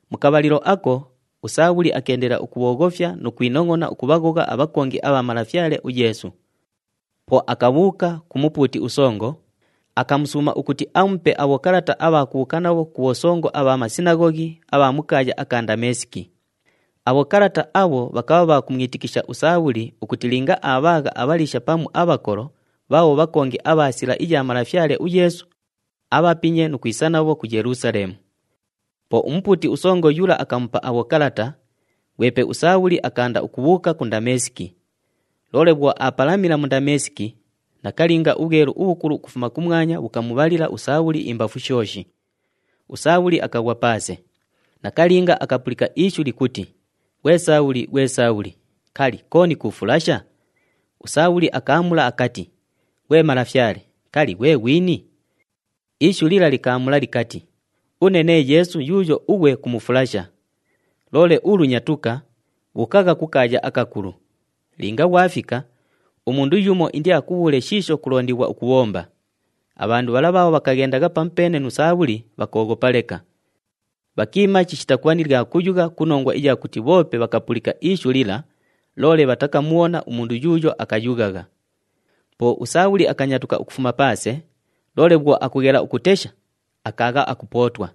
Mu kabhalilo ako, uSaabhuli akeendelela ukubhooghofya nu kwinongʼona ukubhaghogha abhakongi abha Malafyale uYeesu. Po akabhuuka ku mupuuti usongo, akamusuuma ukuti amupe abhokalata abha kubhuuka nabho ku bhosongo abha masinaghoghi agha mu kaaya aka Ndameesiki. Abhokalata abho bhakabha bha kumwitikisha uSaabhuli ukuti linga aabhaagha abhaliisha pamu abhakolo bhaabho bhakongi abha Sila iya Malafyale uYeesu, abhapinye nu kwisa nabho ku Yelusaleemu. Po umupuuti usongo yula akamupa abhokalata, ghwepe uSaabhuli akaanda ukubhuuka ku Ndameesiki. Loole bhwo aapalamila mu Ndameesiki, nakalinga ubhwelu ubhukulu ukufuma kumwanya bhukamubhalila uSaabhuli imbafu shooshi. USaabhuli akaghwa paase. Nakalinga akapulika ishu likuti, “Ghwe Saabhuli! Ghwe Saabhuli! Kali, kooni kuufulasha?” USaabhuli akaamula akati, “Ghwe Malafyale, kali, ghwe ghwini?” Ishu lila likaamula likati, “Une nee Yeesu yuuyo ughwe kumufulasha. Loole ulu nyatuka! Bhuukagha ku kaaya akakulu. Linga ghwafika, umundu yumo indiakubhuule shiisho kulondighwa ukubhomba.” Abhandu bhala bhaabho bhakaghendagha pamupeene nu Saabhuli bhakooghopa leka. Bhakiima chishita kubha ni lya kuyugha ku nongwa iya kuti bhoope bhakapulika ishu lila, loole bhatakamubhona umundu yuuyo akayughagha. Po uSaabhuli akanyatuka ukufuma paase, loole bhwo akughela ukutesha, akaagha akupootwa.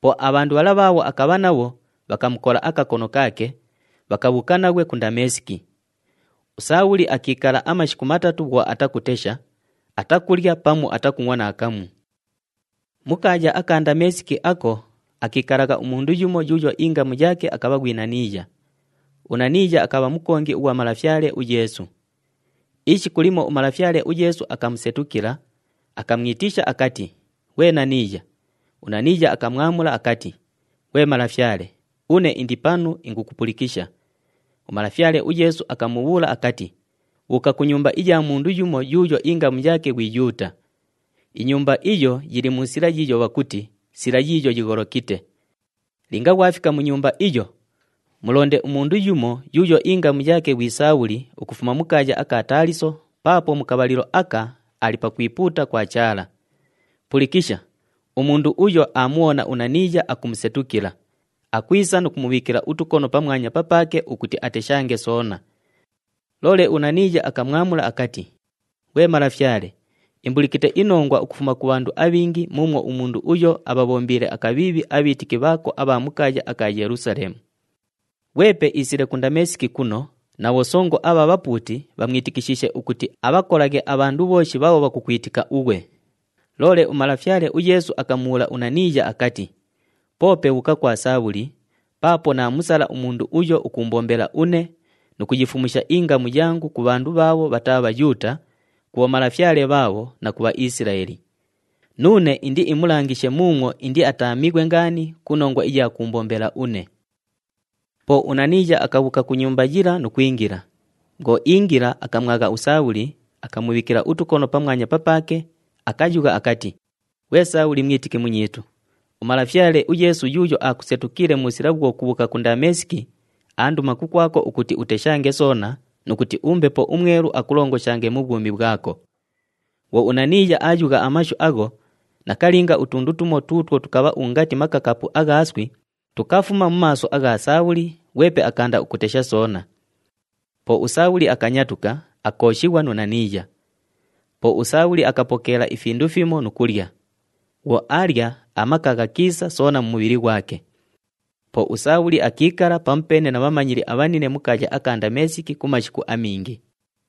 Po abhandu bhala bhaabho akabha nabho bhakamukola akakono kaake, bhakabhuuka naghwe ku Ndameesiki. USaabhuli akiikala amashiku matatu bhwo atakutesha, atakulya pamu atakungʼwa naakamu. Mu kaaya aka Ndameesiki ako, akiikalagha umundu yumo yuuyo ingamu yaake akabha ghwi Naniiya. UNaniiya akabha mukongi ughwa Malafyale uYeesu. Ishiku limo uMalafyale uYeesu akamusetukila, akamwitisha akati, “Ghwe Naniiya!” UNaniiya akamwamula akati, “Ghwe Malafyale, une indi panu ingukupulikisha.” UMalafyale uYeesu akamubhuula akati, “Bhuuka ku nyumba iya mundu yumo yuuyo ingamu yaake ghwi Yuuta. Inyumba iyo yili mu sila yiiyo bhakuti, ‘Sila Yiiyo Yigholokite.’ Linga ghwafika mu nyumba iyo, mulonde umundu yumo yuuyo ingamu yaake ghwi Saabhuli ukufuma mu kaaya aka Taaliso paapo mu kabhalilo aka ali pakwipuuta kwa Chaala. Pulikisha! Umundu uyo aamubhona uNaniiya akumusetukila, akwisa nu kumubhiikila utukono pamwanya papaake ukuti ateshange soona.” Loole uNaniiya akamwamula akati, “Ghwe Malafyale, imbulikite inongwa ukufuma ku bhandu abhingi muumwo umundu uyo abhabhombiile akabhiibhi abhiitiki bhaako abha mu kaaya aka Yelusaleemu. Ghwepe iisile ku Ndameesiki kuno na bhosongo abha bhapuuti bhamwitikishiishe ukuti abhakolaghe abhandu bhooshi bhaabho bhakukwitika ughwe.” Loole uMalafyale uYeesu akamubhuula uNaniiya akati, “Poope bhuuka kwa Saabhuli paapo naamusala umundu uyo ukuumbombela une nu kuyifumusha ingamu yangu ku bhandu bhaabho bhataa Bhayuuta, ku bhomalafyale bhaabho na ku Bhaisilaeli. Nuune indiimulangishe muumwo indiataamighwe ngaani ku nongwa iya kuumbombela une.” Po uNaniiya akabhuuka ku nyumba yila nu kwingila. Bhwo iingila, akamwagha uSaabhuli, akamubhiikila utukono pamwanya papaake, akayugha akati, “Ghwe Saabhuli, mwitiki munyiitu, uMalafyale uYeesu yuuyo aakusetukiile mu sila bhwo kubhuuka ku Ndameesiki, aanduma kukwako ukuti uteshange soona nu kuti uMbepo uMwelu akulongoshange mu bhwumi bhwako.” Bhwo uNaniiya aayugha amashu agho, nakalinga, utundu tumo tuutwo tukabha ungati makakaapu agha iswi tukafuma mu maaso agha Saabhuli, ghwepe akaanda ukutesha soona. Po uSaabhuli akanyatuka, akooshighwa nu Naniiya. Po uSaabhuli akapokeela ifindu fimo nu kulya. Bhwo aalya, amaka ghakiisa soona mu mubhili ghwake. Po uSaabhuli akiikala pamupeene na bhamanyili abhanine mu kaaya aka Ndameesiki ku mashiku amingi.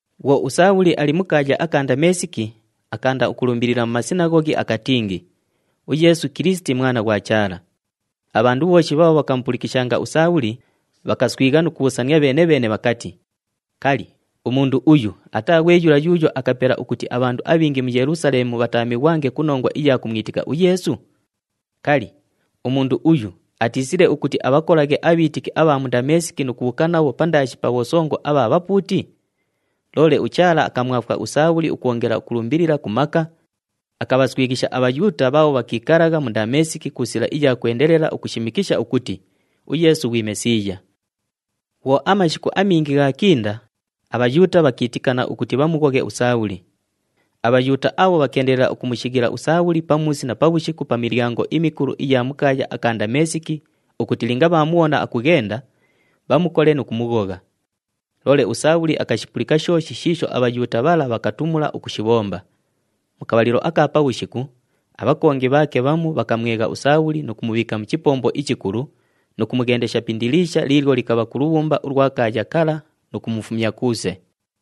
Bhwo uSaabhuli ali mu kaaya aka Ndameesiki, akaanda ukulumbilila mu masinaghoghi akatingi, “UYeesu Kilisiti, Mwana ghwa Chaala.” Abhandu bhooshi bhaabho bhakamupulikishanga uSaabhuli, bhakaswigha nu kubhuusania bheene-bheene bhakati, “Kali, umundu uyu ataa ghwe yula yuuyo akapela ukuti abhandu abhingi mu Yelusaleemu bhataamighwange ku nongwa iya kumwitika uYeesu? Kali, umundu uyu atiisile ukuti abhakolaghe abhiitiki abha mu Ndameesiki nu kubhuuka nabho pandaashi pa bhosongo abha bhapuuti?” Loole uChaala akamwafwa uSaabhuli ukwongela ukulumbilila ku maka, akabhaswighisha aBhayuuta bhaabho bhakiikalagha mu Ndameesiki ku sila iya kwendelela ukushimikisha ukuti, “UYeesu ghwi Mesiiya.” Bhwo amashiku amingi ghaakinda, aBhayuuta bhakiitikana ukuti bhamughoghe uSaabhuli. ABhayuuta abho bhakeendelela ukumushighila uSaabhuli pamuusi na pabhushiku pa milyango imikulu iya mu kaaya aka Ndameesiki ukuti linga bhaamubhona akughenda, bhamukole nu kumughogha. Loole uSaabhuli akashipulika shooshi shiisho aBhayuuta bhala bhakatumula ukushibhomba. Mu kabhalilo aka pabhushiku, abhakongi bhaake bhamu bhakamwegha uSaabhuli nu kumubhiika mu chipombo ichikulu nu kumughendesha pi indiliisha liilyo likabha ku lubhumba ulwa kaaya kala nu kumufumya kuuse.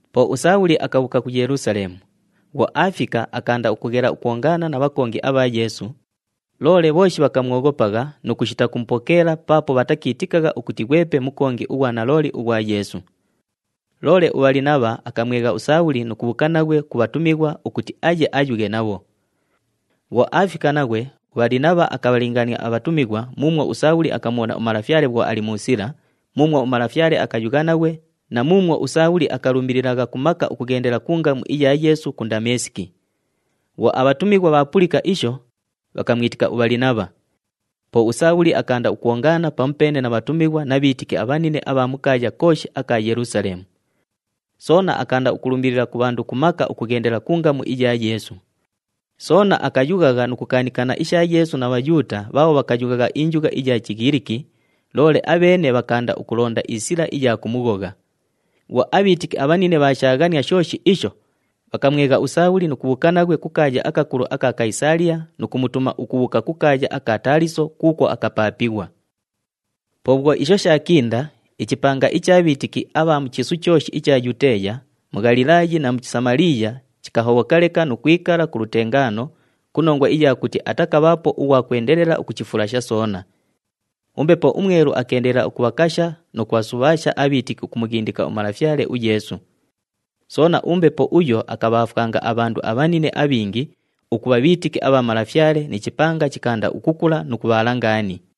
Po uSaabhuli akabhuuka ku Yelusaleemu. Bhwo aafika, akaanda ukughela ukwongaana na bhakongi abha Yeesu, loole bhooshi bhakamwoghopagha nu kushita kumupokeela paapo bhatakiitikagha ukuti ghwepe mukongi ughwa nalooli ughwa Yeesu. Loole uBhalinabha akamwegha uSaabhuli nu kubhuuka naghwe ku bhatumighwa ukuti aye ayughe nabho. Bhwo aafika naghwe, uBhalinabha akabhalingaania abhatumighwa muumwo uSaabhuli akamubhona uMalafyale bhwo ali mu sila, muumwo uMalafyale akayugha naghwe na muumwo uSaabhuli akalumbililagha ku maka ukughendela ku ngamu iya Yeesu ku Ndameesiki. Bhwo abhatumighwa bhaapulika isho, bhakamwitika uBhalinabha. Po uSaabhuli akaanda ukwongaana pamupeene na bhatumighwa na bhiitiki abhanine abha mu kaaya kooshi aka Yelusaleemu. Soona akaanda ukulumbilila ku bhandu ku maka ukughendela ku ngamu iya Yeesu. Soona akayughagha nu kukaanikana isha Yeesu na Bhayuuta bhaabho bhakayughagha injugha iya Chighiliki, loole abheene bhakaanda ukulonda isila iya kumughogha. Bhwo abhiitiki abhanine bhaashaaghania shooshi isho, bhakamwegha uSaabhuli nu kubhuuka naghwe ku kaaya akakulu aka Kayisaaliya nu kumutuma ukubhuuka ku kaaya aka Taaliso kuukwo akapaapighwa. Po bhwo isho shaakinda, ichipanga icha bhiitiki abha mu chiisu chooshi icha Yuteeya, mu Ghalilaayi na mu Samaliiya, chikahobhoka leka nu kwikala ku lutengaano, ku nongwa iya kuti atakabhaapo ughwa kwendelela ukuchifulasha soona. UMbepo uMwelu akeendelela ukubhakasha nu kubhasubhaasha abhiitiki ukumughindika uMalafyale uYeesu. Soona, uMbepo uyo akabhaafwanga abhandu abhanine abhingi ukubha bhiitiki abha Malafyale, ni chipanga chikaanda ukukula nu kubhaala ngaani.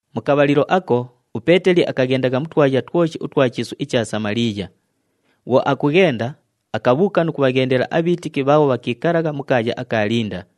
Mu kabhalilo ako, uPeeteli akaghendagha mu twaya twoshi utwa chiisu icha Samaliiya. Bhwo akughenda, akabhuuka nu kubhaghendela abhiitiki bhaabho bhakiikalagha mu kaaya aka Linda.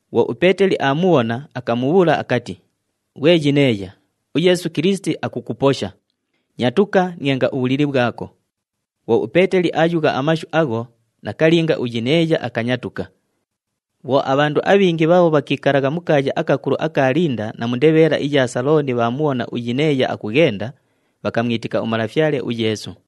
Bhwo uPeeteli aamubhona, akamubhuula akati, “Ghwe Yineeya, uYeesu Kilisiti akukuposha. Nyatuka, nienga ubhulili bhwako.” Bhwo uPeeteli aayugha amashu agho, nakalinga, uYineeya akanyatuka. Bhwo abhandu abhingi bhaabho bhakiikalagha mu kaaya akakulu aka Linda na mu ndebheela iya Salooni bhaamubhona uYineeya akughenda, bhakamwitika uMalafyale uYeesu.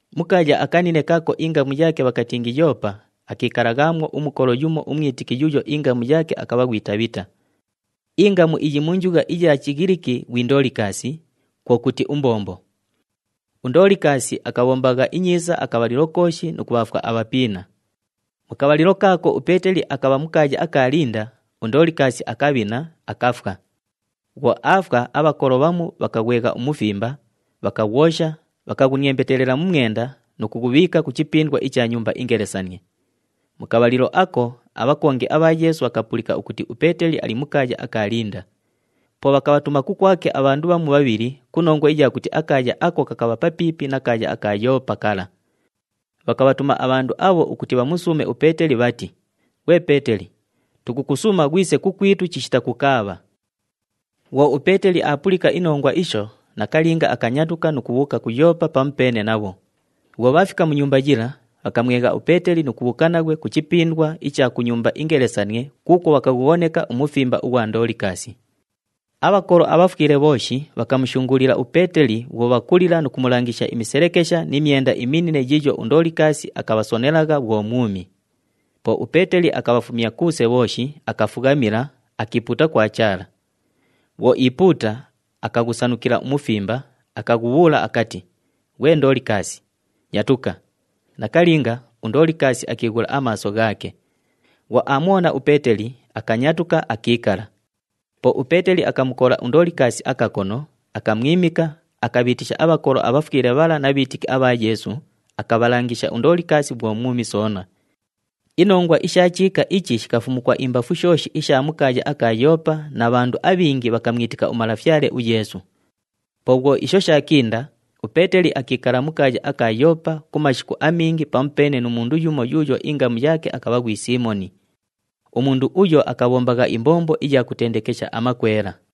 Mu kaaya akanine kaako ingamu yaake bhakatingi Yoopa, akiikalaghaamwo umukolo yumo umwitiki yuuyo ingamu yaake akabha ghwi Tabhita. Ingamu iyi mu njugha iya Chighiliki ghwi Ndoolikaasi, kwo kuti, “Umbombo.” UNdoolikaasi akabhombagha inyiisa akabhalilo kooshi nu kubhaafwa abhapiina. Mu kabhalilo kaako uPeeteli akabha mu kaaya aka Linda, uNdoolikaasi akabhina, akafwa. Bhwo aafwa, abhakolo bhamu bhakaghwegha umufimba, bhakaghwosha, bhakaghuniembetelela mu mwenda nu kughubhiika ku chipindwa icha nyumba ingelesanie. Mu kabhalilo ako, abhakongi abha Yeesu bhakapulika ukuti uPeeteli ali mu kaaya aka Linda. Po bhakabhatuma kukwake abhandu bhamu bhabhili ku nongwa iya kuti akaaya ako kakabha papiipi na kaaya aka Yoopa kala. Bhakabhatuma abhandu abho ukuti bhamusuume uPeeteli bhati, “Ghwe Peeteli, tukukusuuma ghwise kukwitu chishita kukaabha!” Bhwo uPeeteli aapulika inongwa isho, nakalinga akanyatuka nu kubhuuka ku Yoopa pamupeene nabho. Bhwo bhaafika mu nyumba yila, bhakamwegha uPeeteli nu kubhuuka naghwe ku chipindwa icha ku nyumba ingelesanie kuukwo bhakaghughoneka umufimba ughwa Ndoolikaasi. Abhakolo abhafwile bhooshi bhakamushunguulila uPeeteli bhwo bhakulila, nu kumulangisha imiselekesha ni myenda iminine yiiyo uNdoolikaasi akabhasonelagha bhwo mwumi. Po uPeeteli akabhafumya kuuse bhooshi, akafughamila, akiipuuta kwa Chaala. Bhwo iipuuta, akaghusanukila umufimba, akaghubhuula akati, “Ghwe Ndoolikaasi, nyatuka!” Nakalinga, uNdoolikaasi akiighula amaaso ghaake. Bhwo aamubhona uPeeteli, akanyatuka, akiikala. Po uPeeteli akamukola uNdoolikaasi akakono, akamwimika, akabhiitisha abhakolo abhafwile bhala na bhiitiki abha Yeesu, akabhalangisha uNdoolikaasi bhwo mwumi soona. Inongwa isha chiika ichi shikafumukwa imbafu shooshi isha mu kaaya aka Yoopa na bhandu abhingi bhakamwitika uMalafyale uYeesu. Po bhwo isho shaakinda, uPeeteli akiikala mu kaaya aka Yoopa ku mashiku amingi pamupeene nu mundu yumo yuuyo ingamu yaake akabha ghwi Siimoni. Umundu uyo akabhombagha imbombo iya kutendekesha amakwela.